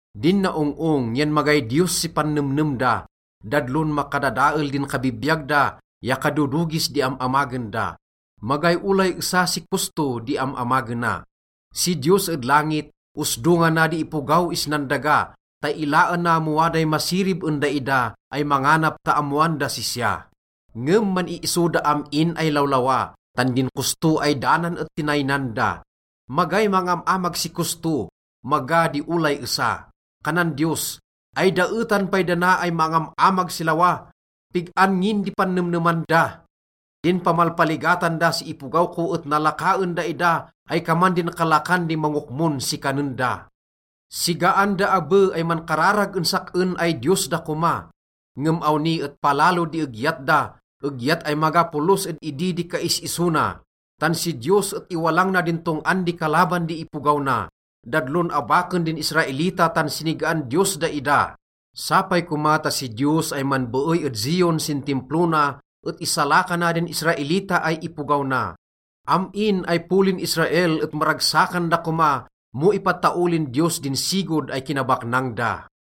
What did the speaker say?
Din naong-ong yan magay Diyos si pannemnem da. Dadlon makadadael din kabibiyag da ya kadodogis di am-amagen da. Magay olay esa si kosto di am-amagena. Si Diyos ed langit, osdongana di ipogaw isnan daga ta ilaena mo waday masirib en daida ay manganap ta ammoan das sisya. Ngem man-iiso da am-in ay lawlawa, tan din kosto ay danan et tinaynan da. Magay mangam-amag si kosto, maga di olay esa. Kanan Diyos, “Ay daetan pay dana ay mangam-amag si lawa! Pig-an ngin di pannemneman da? Din pamalpaligatan da sin ipogaw ko et nalaka en daida ay kaman din kalakan di mangokmon si kanen da. Sigaan da abe ay mankararag en sak-en ay Diyos da koma.” Ngem awni et palalo di egyat da, egyat ay maga polos ed idi di kais-iso na. Tan si Diyos et iwalang na din tong-an di kalaban di ipogaw na. Dadlon abaken din Israelita tan sinigaan Diyos daida. Sapay koma ta si Diyos ay manbeey ed Zion sin Timplo na et isalakana din Israelita ay ipogaw na. Am-in ay polin Israel et maragsakan da koma mo ipataolin Diyos din sigod ay kinabaknang da.